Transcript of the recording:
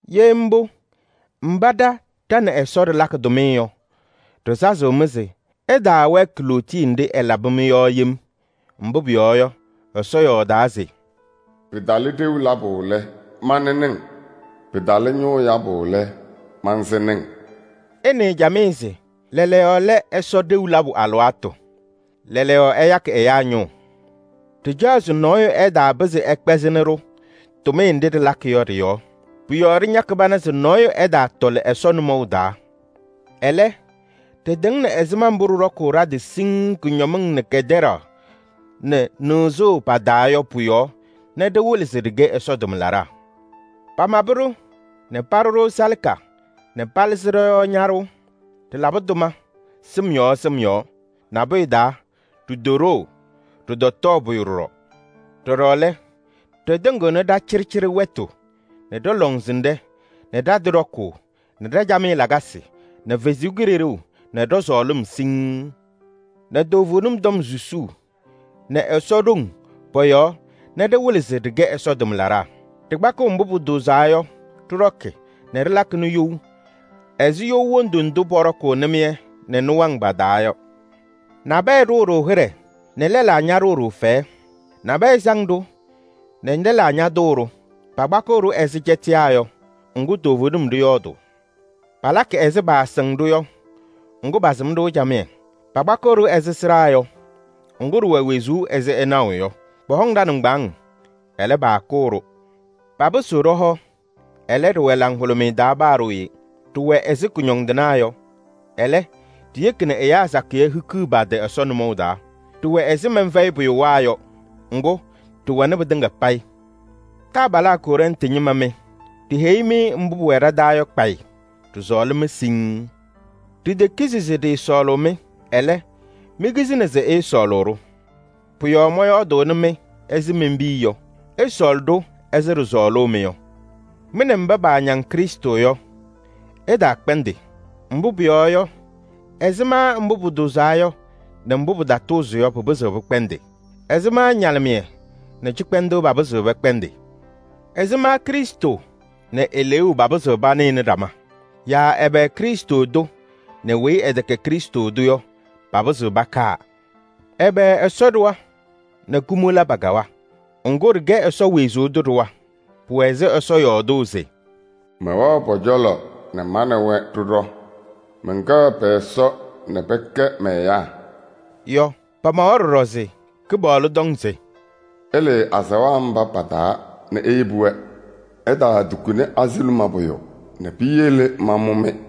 Ye mbʋ, mba ɖa ɖa nɛ Ɛsɔ ɖɩlakɩ tʋmɩyɛ yɔ, ɖɩsazɩɣ-mɩ se ɩtaawɛɛkɩ lootiye nɖɩ ɛlabɩ-mɩ yɔ yem. Mbʋ pʋyɔɔ yɔ, Ɛsɔ yɔɔdaa se: “Pɩtalɩ ɖeu labʋ lɛ, manɩnɩ-ŋ. Pɩtalɩ ñʋʋ yabʋ lɛ, mansɩnɩ-ŋ.” Ɩnɩɩ camɩyɛ se: lɛɛlɛɛyɔ lɛ Ɛsɔ ɖeu labʋ alɩwaatʋ. Lɛɛlɛɛyɔ ɛyakɩ ɛyaa ñʋʋ. Ɖɩcaɣ se nɔɔyʋ ɛtaapɩzɩ ɛkpɛzɩnɩ-ɖʋ tʋmɩyɛ nɖɩ ɖɩlakɩ yɔ ɖɩ-yɔɔ. Pʋ-yɔɔ ɖɩñakɩ pana se nɔɔyʋ ɛtaatɔlɩ Ɛsɔ nʋmɔʋ taa. Ɛlɛ, ɖɩtɩŋnɩ ɛzɩma mbʋ ɖɩɖɔkʋʋ ɖa-tɩ siŋŋ kʋñɔmɩŋ nɛ kɛtɛɖaɣ nɛ nɩɣzʋʋ pa-taa yɔ pʋ-yɔɔ nɛ ɖɩwɩlɩ se ɖɩkɛ Ɛsɔ tʋmlaɖaa. Pamabɩ-ɖʋ nɛ paɖʋ-ɖʋ salaka nɛ palɩzɩ ɖɔ-yɔɔ ñaɖʋʋ. Ɖɩlabɩ tʋma sɩm yɔɔ sɩm yɔɔ: nabʋyʋ taa, ɖitoɖoo, ɖɩtɔtɔɔ pʋyʋ ɖɔɖɔ. Ɖɔɖɔ lɛ, ɖɩtɩŋɩɣnɩ ɖa-cɩɖɩcɩɖɩ wɛtʋ nɛ ɖɔ-lɔŋsɩnɖɛ nɛ ɖa-tɩ ɖɔkʋʋ nɛ ɖa-camɩyɛ lakasɩ nɛ Ɛsɔ Kalɩzaɣ nɛ ɖɔ-sɔɔlɩm siŋŋ nɛ toovenim tɔm susuu nɛ Ɛsɔ ɖoŋ pɔ-yɔɔ nɛ ɖɩwɩlɩ se ɖɩkɛ Ɛsɔ tʋmlaɖaa. Ɖɩkpakɩɣ mbʋ pʋtʋʋzaa yɔ ɖɩɖɔkɩ nɛ ɖɩlakɩnɩ you ɛzɩ you wondu ndʋ pɔɖɔkʋʋ nɩmɩyɛ nɛ nɩwaŋ pa-taa yɔ. Nabɛyɛ ɖʋʋ-ɖʋ hɩɖɛ nɛ lɛlaa ñaɖʋʋ-ɖʋ fɛyɛ. Nabɛyɛ saŋ-ɖʋ nɛ lɛlaa ñatʋʋ-ɖʋ. Pakpakɩɣ-ɖʋ ɛzɩ cɛtɩyaa yɔ, ŋgʋ toovenim ɖɩyɔɔdʋʋ. Palakɩ ɛzɩ paasɩŋ-ɖʋ yɔ, ŋgʋ pasɩm-ɖʋ camɩyɛ. Pakpakɩɣ-ɖʋ ɛzɩ sɩɖaa yɔ, ŋgʋ ɖɩwɛ wezuu ɛzɩ ɩnaɣʋ yɔ. Pɔhɔŋ ɖa-nɩŋgbaaŋ, ɛlɛ, paakʋʋ-ɖʋ. Papɩsɩɣ ɖɔ-hɔ, ɛlɛ, ɖɩwɛ laŋhʋlʋmɩyɛ taa paa ɖooye. Ɖɩwɛ ɛzɩ kʋñɔndɩnaa yɔ, ɛlɛ, ɖiyeki nɛ ɛyaa sakɩyɛ hikiɣ pa-tɩ Ɛsɔ nʋmɔʋ taa. Ɖɩwɛ ɛzɩ mɛnfɛyɩpʋyʋwaa yɔ, ŋgʋ ɖɩwɛnɩ pɩtɩŋa payɩ. Taabalaa Kɔrɛntɩ ñɩma mɩ, ɖiheyi-mɩ mbʋ pʋwɛ ɖa-taa yɔ kpayɩ. Ɖɩsɔɔlɩ-mɩ siŋŋ. Ɖitekizi se ɖɩɩsɔɔlʋʋ-mɩ, ɛlɛ, mikizini se ɩɩsɔɔlʋʋ-ɖʋ. Pʋ-yɔɔ mɔyɔɔdʋʋnɩ-mɩ ɛzɩ men-piya yɔ: ɩsɔɔlɩ-ɖʋ ɛzɩ ɖɩsɔɔlʋʋ-mɩ yɔ. Mɩ nɛ mba paañaŋ Krɩstʋ yɔ, ɩtaakpɛndɩ. Mbʋ pʋyɔɔ yɔ, ɛzɩma mbʋ pʋtʋʋzaa yɔ nɛ mbʋ pɩtatʋʋzɩ yɔ pɩpɩzɩɣ pɩkpɛndɩ? Ɛzɩma ñalɩmɩyɛ nɛ cɩkpɛndʋʋ papɩzɩɣ pɛkpɛndɩ? Ɛzɩma Krɩstʋ nɛ Eleeu papɩzɩɣ panɩnɩ ɖama? Yaa ɛbɛ Krɩstʋ tʋ nɛ weyi ɛtɛkɛ Krɩstʋ tʋ yɔ papɩzɩɣ pakaa? Ɛbɛ Ɛsɔ ɖɩɣa nɛ kumola pakawa? Ŋgʋ, ɖɩkɛ Ɛsɔ wezuu tʋ ɖɩɣa. Pʋwɛ ɛzɩ Ɛsɔ yɔɔdʋʋ se: “Mɛwɛɣ pɔ-cɔlɔ nɛ ma nɛ wɛ ɖɩɖɔ. Mɛnkɛɣ pɛ-Ɛsɔ nɛ pɛkɛ mɛ-ɛyaa” yɔ. Pamawa ɖɔɖɔ se: “Kɩpaɣlʋ tɔŋ se ɩlɩɩ azaɣa mba pa-taa nɛ iyebi-wɛ. Ɩtaatukuni azuluma pʋyʋ nɛ piyele mamʋ-mɩ.